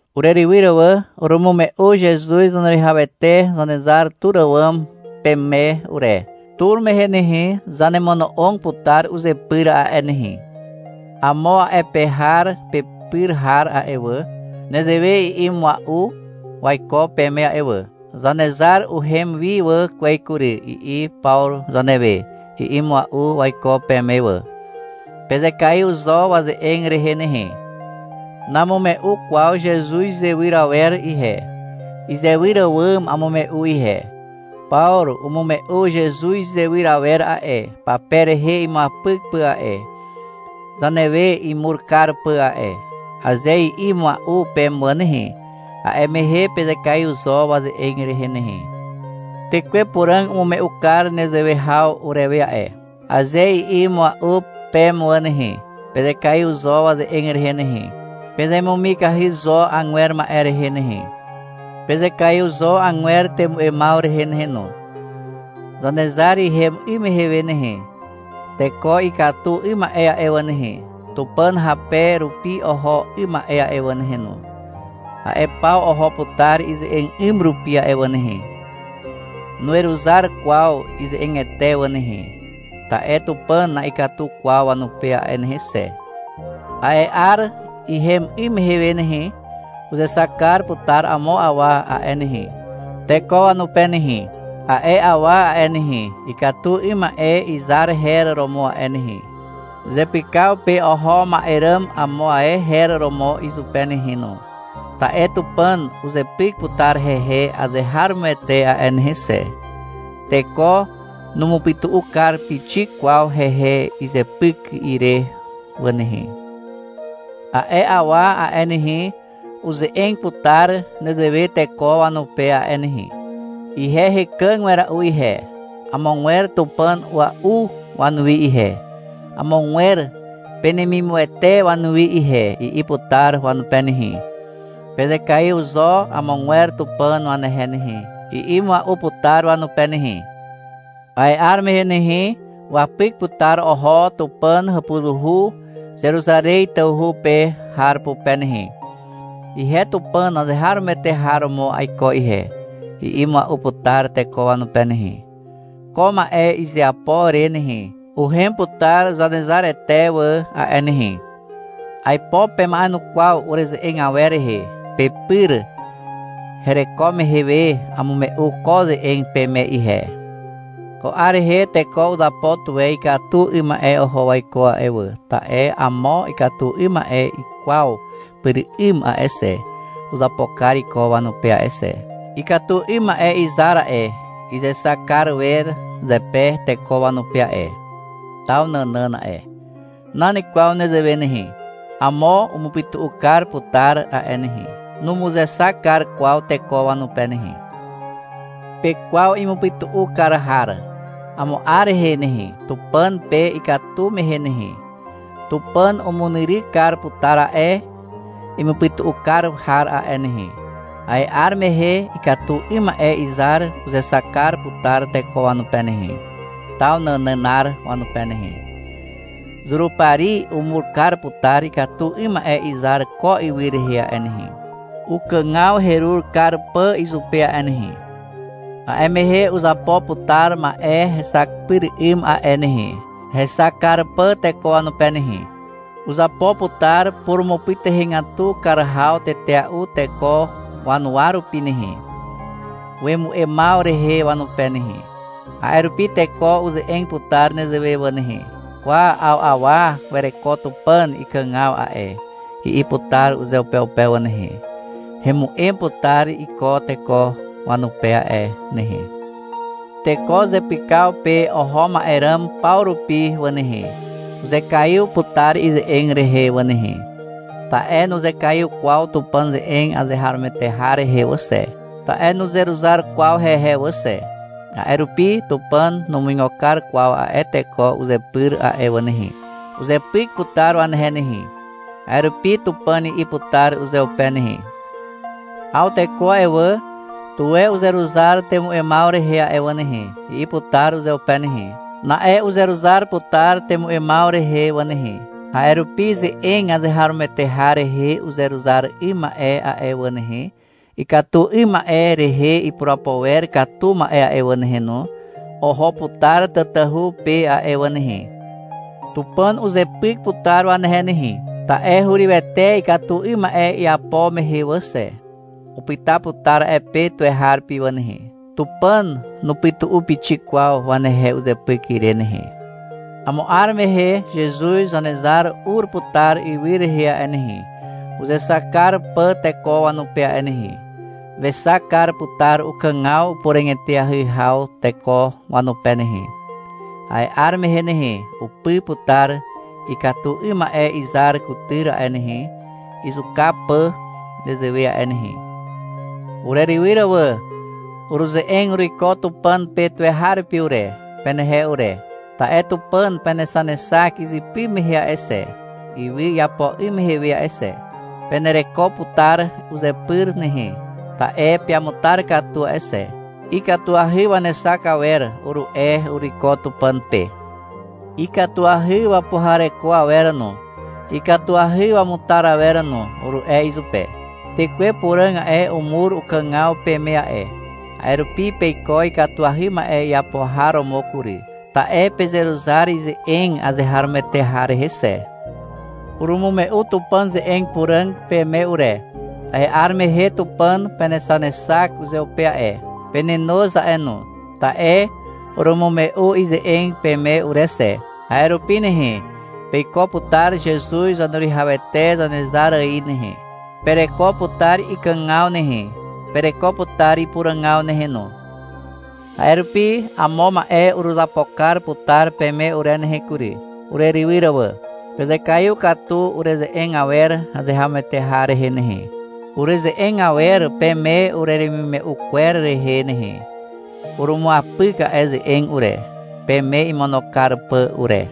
Urerywyr wà, urumume'u Zezuz Zaneruwihawete Zanezar tur àwàm peme ure. Tur mehe nehe, zanemono'og putar uzepyr a'e nehe. Amo a'e pe har pepyr har a'e wà, nezewe i'i mua'u waiko peme a'e wà. — Zanezar uhem wi wà kwez kury, i'i Pawru zanewe, i'i mua'u waiko peme wà. Pezekaiw zo waze'eg rehe nehe. Namume'u kwaw Zezuz izewyr awer ihe. Izewyr àwàm amume'u ihe. — Pawru umume'u Zezuz izewyr awer a'e, pape rehe imuapyk pà a'e, zanewe imur kar pà a'e, aze i'i mua'u peme wà nehe, a'e mehe pezekaiw zo waze'eg rehe nehe. — Tekwe Puràg umume'u kar nezewe haw urewe a'e, aze i'i mua'u peme wà nehe, pezekaiw zo waze'eg rehe nehe. Pezemumikahy zo agwer ma'e rehe nehe. Pezekaiw zo agwer temu'emaw rehe nehe no. Zanezar ihem 'ym mehe nehe, teko ikatu 'ym ma'e a'e wà nehe, Tupàn hape rupi oho 'ym ma'e a'e wà nehe no, a'e paw oho putar ize'eg 'ym rupi a'e wà nehe. Nuweruzar kwaw ize'egete wà nehe, ta'e Tupàn na'ikatu kwaw wanupe a'e nehe xe. A'e 'ar ihem 'ym mehe nehe, uzexak kar putar amo awa a'e nehe, teko wanupe nehe. A'e awa a'e nehe, ikatu 'ym ma'e izar her romo a'e nehe. Zepykaw pe oho ma'e ràm amo ae her romo izupe nehe no, ta'e Tupàn uzepyk putar hehe azeharomoete a'e nehe xe. Teko numupytu'u kar pixik kwaw hehe izepyk ire wà nehe. A'e awa a'e nehe, uze'eg putar nezewe teko wanupe a'e nehe. — Ihe hekàg wera'u ihe, amogwer tupàn a'ua'u wanuwi ihe, amogwer penemimuwete wanuwi ihe, i'i putar wanupe nehe. — Pezekaiw zo amogwer tupàn wanehe nehe, i'i mua'u putar wanupe nehe. A'e 'ar mehe nehe, wapyk putar oho Tupàn hàpuzuhu Zeruzarez tawhu pe har pupe nehe. — Ihe Tupàn azeharomoete har romo aiko ihe, i'i mua'u putar teko wanupe nehe. Ko ma'e izeapo re nehe, uhem putar Zanezarete wà a'e nehe. Aipo pema'enukwaw ureze'eg awer rehe. Pepyr hereko mehe we amume'u ko ze'eg peme ihe. Ko 'ar rehe teko uzapo tuwe ikatu 'ym ma'e oho waiko a'e wà, ta'e amo ikatu 'ym ma'e ikwaw pyr 'ym a'e xe, uzapo kar iko wanupe a'e xe. Ikatu 'ym ma'e izar a'e, izexak kar wer zepe teko wanupe a'e, taw nànàn a'e. Nan kwaw nezewe nehe. Amo umupytu'u kar putar a'e nehe. Numuzexak kar kwaw teko wanupe nehe. Pekwaw imupytu'u kar har. Amo 'ar rehe nehe, Tupàn pe ikatu mehe nehe, Tupàn umunyryk kar putar a'e imupytu'u kar har a'e nehe. A'e 'ar mehe ikatu 'ym ma'e izar uzexak kar putar teko wanupe nehe, taw nànànar wanupe nehe. Zurupari umur kar putar ikatu 'ym ma'e izar ko ywy rehe a'e nehe, ukàgaw herur kar pà izupe a'e nehe. A'e mehe uzapo putar ma'e hexak pyr 'ym a'e nehe, hexak kar pà teko wanupe nehe. Uzapo putar purumupytuhegatu kar haw tetea'u teko wanuwa rupi nehe, wemu'emaw rehe wanupe nehe. A'e rupi teko uze'eg putar nezewe wà nehe, — Kwa, 'aw awa wereko Tupàn ikàgaw a'e, i'i putar uzeupeupe wà nehe. Hemu'em putar iko teko wanupe a'e nehe. Teko zepykaw pe oho ma'e ràm paw rupi wà nehe, uzekaiw putar ize'eg rehe wà nehe. Ta'e nuzekaiw kwaw Tupàn ze'eg azeharomoete har rehe wà xe. Ta'e nuzeruzar kwaw hehe wà xe. A'e rupi Tupàn numuigo kar kwaw a'e teko uzepyr a'e wà nehe. Uzepyk putar wanehe nehe. A'e rupi Tupàn i'i putar uzeupe nehe. — Aw teko a'e wà, tuwe uzeruzar temu'emaw rehe a'e wà nehe, i'i putar uzeupe nehe. Na'e uzeruzar putar temu'emaw rehe wà nehe. A'e rupi ze'eg azeharomoete har rehe uzeruzar 'ym ma'e a'e wà nehe, ikatu 'ym ma'e rehe ipurapo wer katu ma'e a'e wà nehe no, oho putar tatahu pe a'e wà nehe. Tupàn uzepyk putar wanehe nehe. Ta'e hurywete ikatu 'ym ma'e iapo mehe wà xe. Upyta putar a'e pe tuweharupi wà nehe. Tupàn nupytu'u pixik kwaw wanehe uzepyk ire nehe. Amo 'ar mehe Zezuz Zanezar ur putar ywy rehe a'e nehe, uzexak kar pà teko wanupe a'e nehe. Wexak kar putar ukàgaw upuràg eteahy haw teko wanupe nehe. A'e 'ar mehe nehe, upy putar ikatu 'ym ma'e izar kutyr a'e nehe, izuka pà nezewe a'e nehe. Urerywyr wà. Uruze'eg uruiko Tupàn pe tuweharupi ure, penehe ure. Ta'e Tupàn penexanexak izypy mehe a'e xe, ywy iapo 'ym mehe a'e xe. Penereko putar uzepyr nehe. Ta'e peamutar katu a'e xe. — Ikatuahy wanexak awer, uru'e uruiko Tupàn pe. — Ikatuahy wapuhareko awer no, ikatuahy wamutar awer no, uru'e izupe. Tekwe Puràg a'e, umur ukàgaw peme a'e, a'e rupi peiko ikatuahy ma'e iapo har romo kury. Ta'e pezeruzar ize'eg azeharomoete har rehe xe. Urumume'u Tupàn ze'eg puràg peme ure. A'e 'ar mehe Tupàn penexanexak uzeupe a'e. Penenoz a'e no, ta'e urumume'u ize'eg peme ure xe. A'e rupi nehe, peiko putar Zezuz Zaneruwihawete Zanezar ài nehe, pereko putar ikàgaw nehe, pereko putar ipuràgaw nehe no. A'e rupi amo ma'e uruzapo kar putar peme ure nehe kury, urerywyr wà. Pezekaiw katu ureze'eg awer azeharomoete har rehe nehe, ureze'eg awer peme ureremimume'u kwer rehe nehe. Urumuapyk a'e ze'eg ure, peme imono kar pà ure.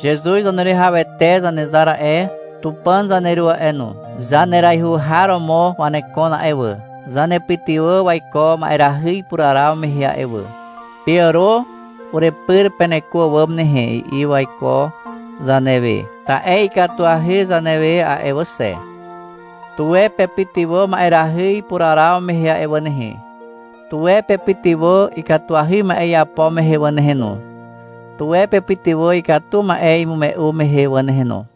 Zezuz Zaneruwihawete Zanezar a'e, Tupàn zaneru a'e no, zaneraihu har romo wanekon a'e wà, zanepytywà waiko ma'erahy ipuraraw mehe a'e wà. — Peàro urepyr peneko àwàm nehe, i'i waiko zanewe. Ta'e ikatuahy zanewe a'e wà xe. Tuwe pepytywà ma'erahy ipuraraw mehe a'e wà nehe. Tuwe pepytywà ikatuahy ma'e iapo mehe wà nehe no. Tuwe pepytywà ikatu ma'e imume'u mehe wà nehe no.